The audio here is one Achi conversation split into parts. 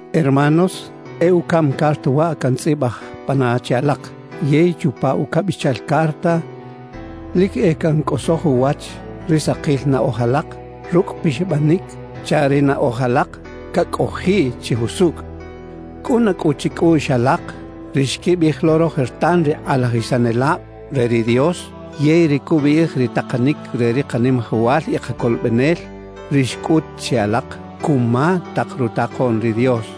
Hermanos, e ucaꞌm carta waꞌ cantzꞌibaj pana che alak. Yey chupa ucabichal carta lic e cancꞌosoj uwach ri sakil naꞌoj alak rucꞌ pixabanic, chaꞌ ri naꞌoj alak cacꞌojiꞌ chi jusucꞌ. Cꞌuna cꞌu chicꞌuꞌx alak ri xquibiꞌij lo rojertan ri kꞌalajisanelab re ri Dios, yey ri cubiꞌij ri takanic re ri Kanimajawal y Kacolobenel, ri xcꞌut che alak cuma tak rutakoꞌn ri Dios.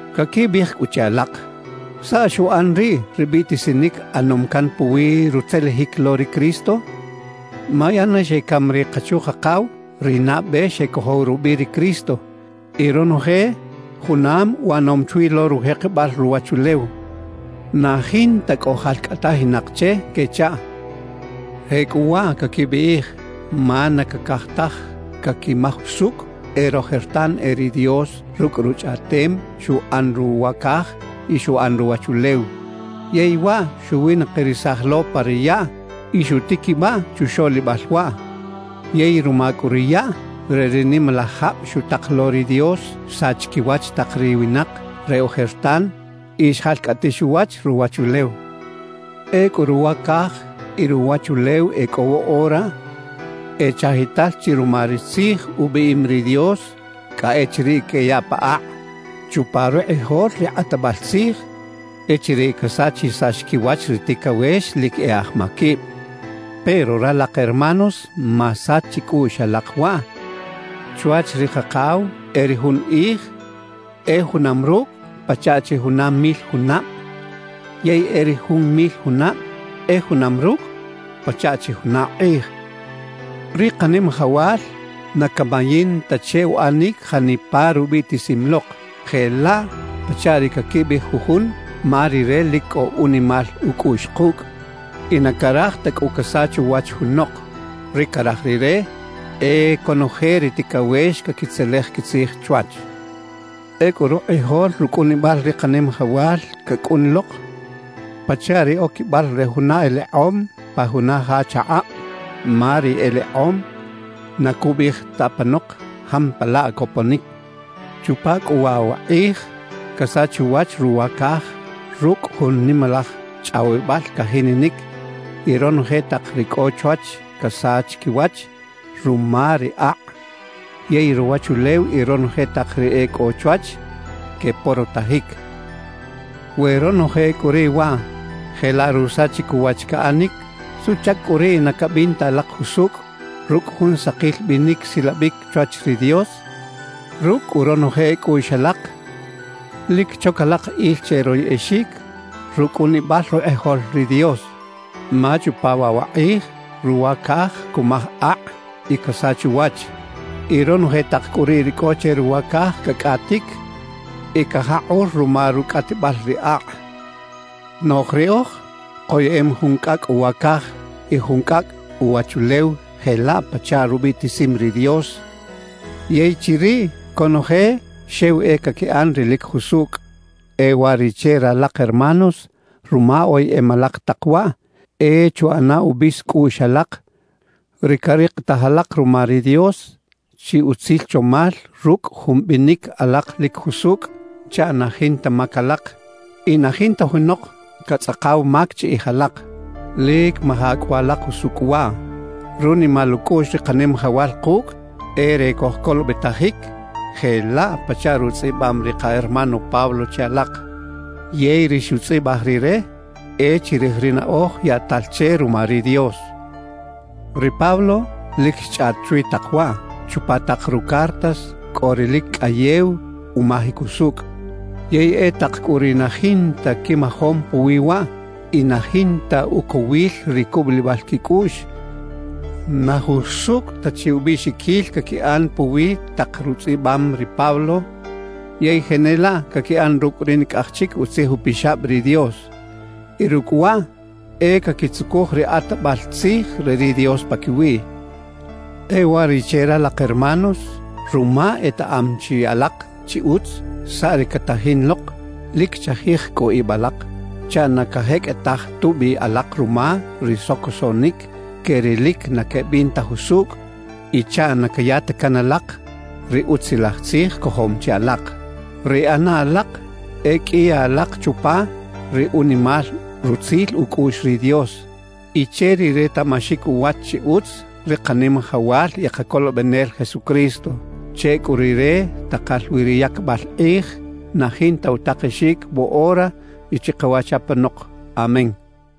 Caquibiꞌij cꞌu che alak: «¿Saꞌ xuꞌan riꞌ ri biꞌtisinic ꞌanom can puwi rutzelejic lo ri Cristo? Ma ya ne xecam ri kachu-kakaw, ri nabe xecojow rubiꞌ ri Cristo; y ronoje junam uꞌanom chwi lo rujekebal ruwachulew, na jinta cꞌo jalcꞌatajinak che» quechaꞌ. Jecꞌuwaꞌ caquibiꞌij ma na cacaj taj caquimaj usucꞌ e rojertan e ri Dios rucꞌ Ruchꞌaꞌtem xuꞌan ruwa caj y xuꞌan ruwachulew, yey waꞌ xuwinakirisaj lo pa ri yaꞌ y xutiquibaꞌ chuxoꞌlibal waꞌ. Yey ruma cꞌu ri yaꞌ re ri nimalaj jab xutak lo ri Dios, xsach quiwach tak ri winak re ojertan y xjalcꞌatix uwach ruwachulew. Ecꞌu ruwa caj y ruwachulew e cꞌo woꞌora, e chajital chi ruma ri tzij ubiꞌim ri Dios cꞌa echiriꞌ queyaꞌ pa akꞌ chupa rukꞌijol ri kꞌatbal tzij, echiriꞌ casachisax quiwach ri ticawex lic e aj maquib. Pero ralak hermanos, masach chicꞌuꞌx alak waꞌ: Chwach ri Kakaw e ri jun kꞌij e junam rucꞌ pachaꞌ chi juna mil junab; yey e ri jun mil junab e junam rucꞌ pachaꞌ chi juna kꞌij. Ri Kanimajawal na camayin ta che uꞌanic janipa rubiꞌtisim lok, jelaꞌ pachaꞌ ri caquibiꞌij jujun. Ma Rire lic cꞌo unimal ucꞌuꞌx kucꞌ, y na caraj ta cꞌu casach uwach junok. Ri caraj Rire e conoje ri ticawex caquitzelej quitzij chwach. Ecꞌu rukꞌijol rucꞌunibal ri Kanimajawal cacꞌun lok pachaꞌ ri oquibal re juna elekꞌom pa juna ja chakꞌab, ma ri elekꞌom na cubiꞌij ta apanok jampalaꞌ coponic. Chupa cꞌu waꞌ wa kꞌij casach uwach ruwa caj rucꞌ jun nimalaj chꞌawibal cajininic y ronoje tak ri cꞌo chwach casach quiwach ruma ri akꞌ. Yey ruwachulew y ronoje tak ri e cꞌo chwach queporotajic. We ronoje cꞌu riꞌ waꞌ jelaꞌ rusachic uwach caꞌanic, ¿suꞌchac cꞌu riꞌ na cabin ta alak jusucꞌ rucꞌ jun sakil binic silabic chwach ri Dios? Rucꞌ cꞌu ronoje cꞌuꞌx alak, lic choc alak il che royꞌexic rucꞌunibal rukꞌijol ri Dios. Ma chupa waꞌ wa kꞌij ruwa caj cumaj akꞌ y casach uwach, y ronoje tak cꞌu riꞌ ri cꞌo che ruwa caj cacꞌatic y cajakꞌur ruma rucꞌatibal ri akꞌ. Noꞌj riꞌoj koyeꞌem jun cꞌacꞌ uwa caj y jun cꞌacꞌ uwachulew jelaꞌ pachaꞌ rubiꞌtisim ri Dios. Yey chiriꞌ, conoje xew e caquiꞌan ri lic jusucꞌ. E uwariꞌche ralak hermanos, ruma oyeꞌem alak tak waꞌ, e chuꞌana ubis cꞌuꞌx alak ri carikitaj alak ruma ri Dios chi utzil chomal rucꞌ jun binic alak lic jusucꞌ, chaꞌ na jinta mac alak y na jinta junok catzꞌakaw mac chiꞌij alak. Lic maja cꞌu alak usucꞌ waꞌ: Runimal ucꞌuꞌx ri Kanimajawal kucꞌ e re cojcolobetajic jelaꞌ pachaꞌ rutzꞌibam ri ka hermano Pablo che alak, yey ri xutzꞌibaj rire e chirij ri naꞌoj yaꞌtal che ruma ri Dios. Ri Pablo lic xchꞌaꞌt chwi tak waꞌ. Chupa tak rucartas cꞌo ri lic cꞌayew umajic usucꞌ. Yey e tak cꞌu ri na jinta quimajom puwi waꞌ y na jinta ucowil ri cubulibal quicꞌuꞌx, na jusucꞌ ta chi ubiꞌxiquil caquiꞌan puwi tak rutzꞌibam ri Pablo yey jenelaꞌ caquiꞌan rucꞌ ri nicꞌaj chic Utzij Upixab ri Dios; y rucꞌ waꞌ e caquitzucuj ri kꞌatbal tzij re ri Dios paquiwiꞌ. E uwariꞌche ralak hermanos, ruma etaꞌam chi alak chi utz saꞌ ri catajin lok, lic chajij cꞌu ib alak chaꞌ na cajeqꞌuetaj tubi alak ruma ri socosoꞌnic que ri lic na quebin ta jusucꞌ y chaꞌ na caya ta can alak ri Utzilaj Tzij cojom chi alak. Ri ꞌana alak e qꞌuiya alak chupa ri unimal rutzil ucꞌuꞌx ri Dios y che ri retaꞌmaxic uwach chi utz ri Kanimajawal y Kacolobenel Jesucristo. Che cꞌu Rire takal wi ri yacbal kꞌij na jinta utakexic woꞌora y chikawach apanok. Amén.